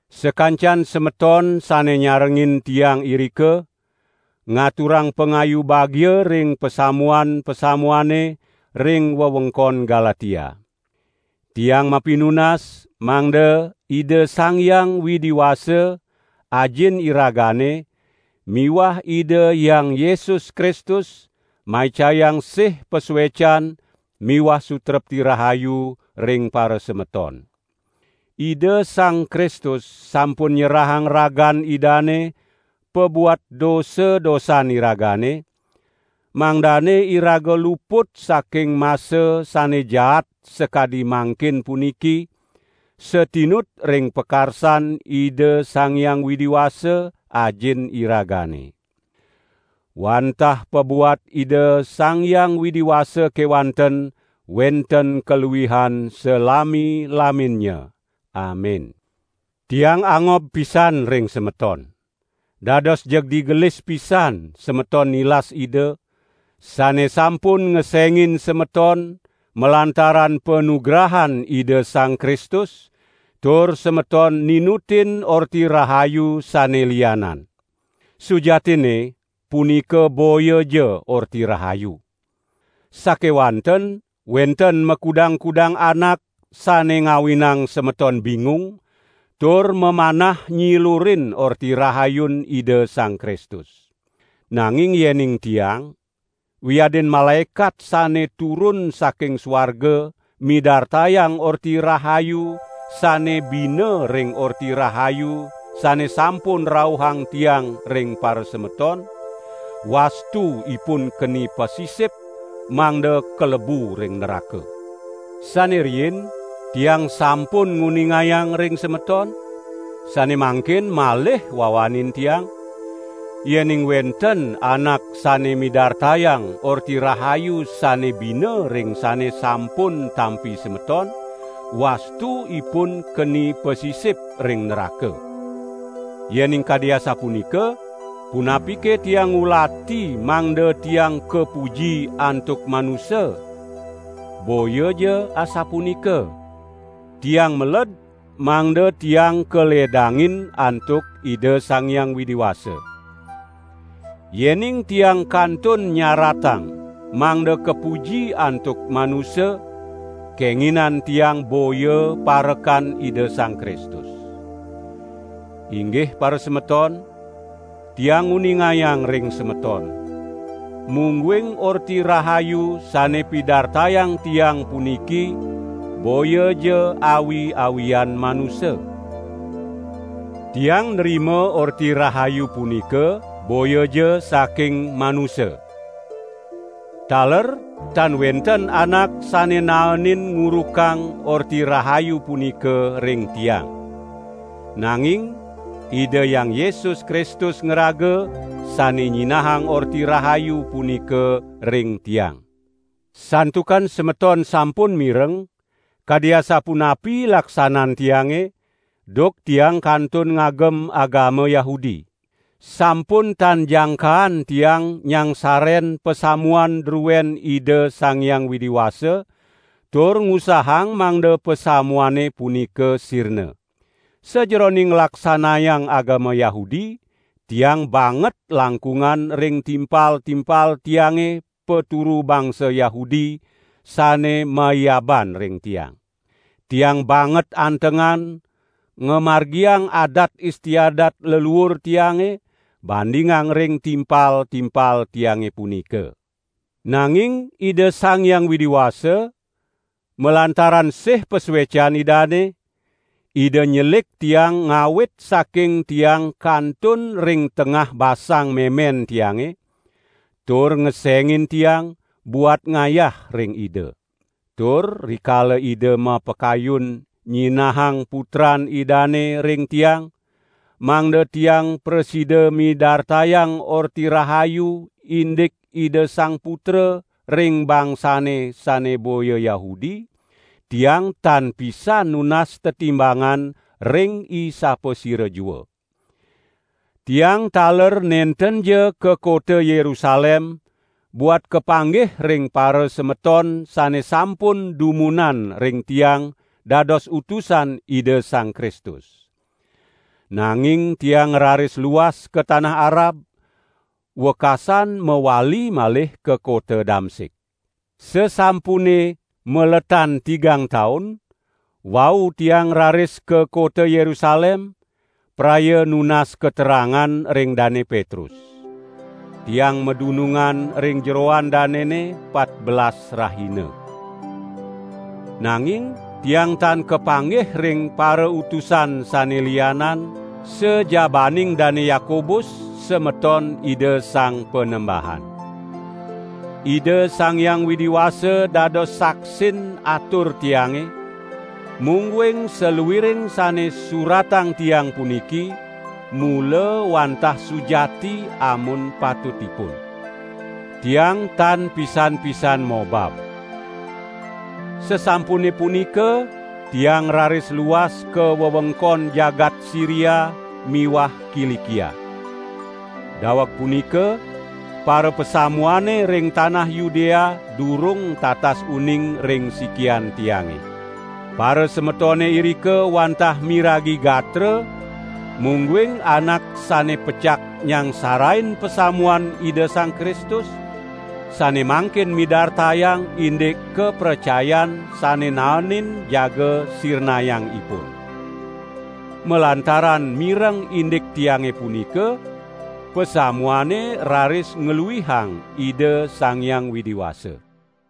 Sakancan semeton sane nyarengin tiang irika, ngaturang pangayu bagia ring pasamuan-pasamuane ring wewengkon Galatia. Tiang mapinunas mangda Ida Sang Hyang Widi Wasa, Ajin iragane miwah Ida Hyang Yesus Kristus maicayang sih pasuecan miwah sutrepti rahayu ring parasemeton. Ida Sang Kristus sampun nyerahang ragan Idane pabuat dosa-dosan iragane, mangdane iraga luput saking masa sane jaat sakadi mangkin puniki, satinut ring pakarsan Ida Sang Hyang Widi Wasa, Ajin iragane. Wantah pabuat Ida Sang Hyang Widi Wasa kewanten wenten kaluihan salami-laminnya. Amin. Tiang angob pisan ring semeton. Dados jeg digelis pisan semeton nilas Ida, sane sampun ngesengin semeton malantaran panugrahan Ida Sang Kristus, tur semeton ninutin orti rahayu sane lianan. Sujatinne, punika boyaja Orti Rahayu. Sakewanten wenten makudang-kudang anak sane ngawinang semeton bingung, tur mamanah nyilurin Orti Rahayun Ida Sang Kristus. Nanging yening tiang, wiadin malaekat sane turun saking suarga midartayang orti rahayu sane bina ring Orti Rahayu sane sampun rauhang tiang ring parasemeton, wastu ipun keni pasisip mangda kalebu ring nraka. Sane riin tiang sampun nguningayang ring semeton, sane mangkin malih wawanin tiang: yening wenten anak sane midartayang orti rahayu sane bina ring sane sampun tampi semeton, wastu ipun keni pasisip ring nraka. Yening kadi asapunika, punapike tiang ngulati mangda tiang kapuji antuk manusa? Boyaja asapunika! Tiang meled mangda tiang kaledangin antuk Ida Sang Hyang Widi Wasa. Yening tiang kantun nyaratang mangda kapuji antuk manusa, kenginan tiang boya parekan Ida Sang Kristus. Inggih parasemeton, tiang nguningayang ring semeton, mungguing Orti Rahayu sane pidartayang tiang puniki boyaja awi-awian manusa. Tiang nrima Orti Rahayu punika boyaja saking manusa. Taler tan wenten anak sane naenin ngurukang Orti Rahayu punika ring tiang. Nanging Ida Hyang Yesus Kristus ngraga sane nyinahang Orti Rahayu punika ring tiang. Santukan semeton sampun mireng, kadi asapunapi laksanan tiange, duk tiang kantun ngagem agama Yahudi. Sampun tan jangkaan tiang nyangsaren pasamuan druen Ida Sang Hyang Widi Wasa, tur ngusahang mangda pasamuane punika sirna. Sajeroning nglaksanayang agama Yahudi, tiang banget langkungan ring timpal-timpal tiange paturu bangsa Yahudi sane maiaban ring tiang. Tiang banget antengan ngamargiang adat istiadat leluur tiange, bandingang ring timpal-timpal tiange punika. Nanging Ida Sang Hyang Widi Wasa, malantaran sih pasuecan Idane, Ida nyelik tiang ngawit saking tiang kantun ring tengah basang memen tiange, tur ngesengin tiang, buat ngayah ring Ida. Tur rikala Ida mapakayun: nyinahang Putran Idane ring tiang, mangda tiang prasida midartayang Orti Rahayu indik Ida Sang Putra ring bangsane sane boya Yahudi, tiang tan pisan nunas tetimbangan ring isapasira jua. Tiang taler nentenja ka kota Yerusalem buat kapanggih ring parasemeton sane sampun dumunan ring tiang dados utusan Ida Sang Kristus. Nanging tiang ngraris luas ka tanah Arab, wekasan mawali malih ka kota Damsik. Sasampune maletan tigang taun, wau tiang raris ka kota Yerusalem, praya nunas katerangan ring Dane Petrus. Tiang madunungan ring jeroan danene patbelas rahina. Nanging tiang tan kapanggih ring parautusan sane lianan, sajabaning Dane Yakobus, semeton Ida Sang Panembahan. Ida Sang Hyang Widi Wasa dados saksin atur tiange, mungguing saluiring sane suratang tiang puniki, mula wantah sujati amun patutipun. Tiang tan pisan-pisan mobab. Sasampune punika tiang raris luas ka wewengkon jagat Siria miwah Kilikia. Daweg punika, parapasamuane ring tanah Yudea durung tatas uning ring sikian tiange. Parasemetone irika wantah miragi gatra, mungguing anak sane pecak nyangsarain pasamuan Ida Sang Kristus, sane mangkin midartayang indik kapracayan sane naenin jaga sirnayang ipun. Malantaran mireng indik tiange punika, pasamuane raris ngluihang Ida Sang Hyang Widi Wasa.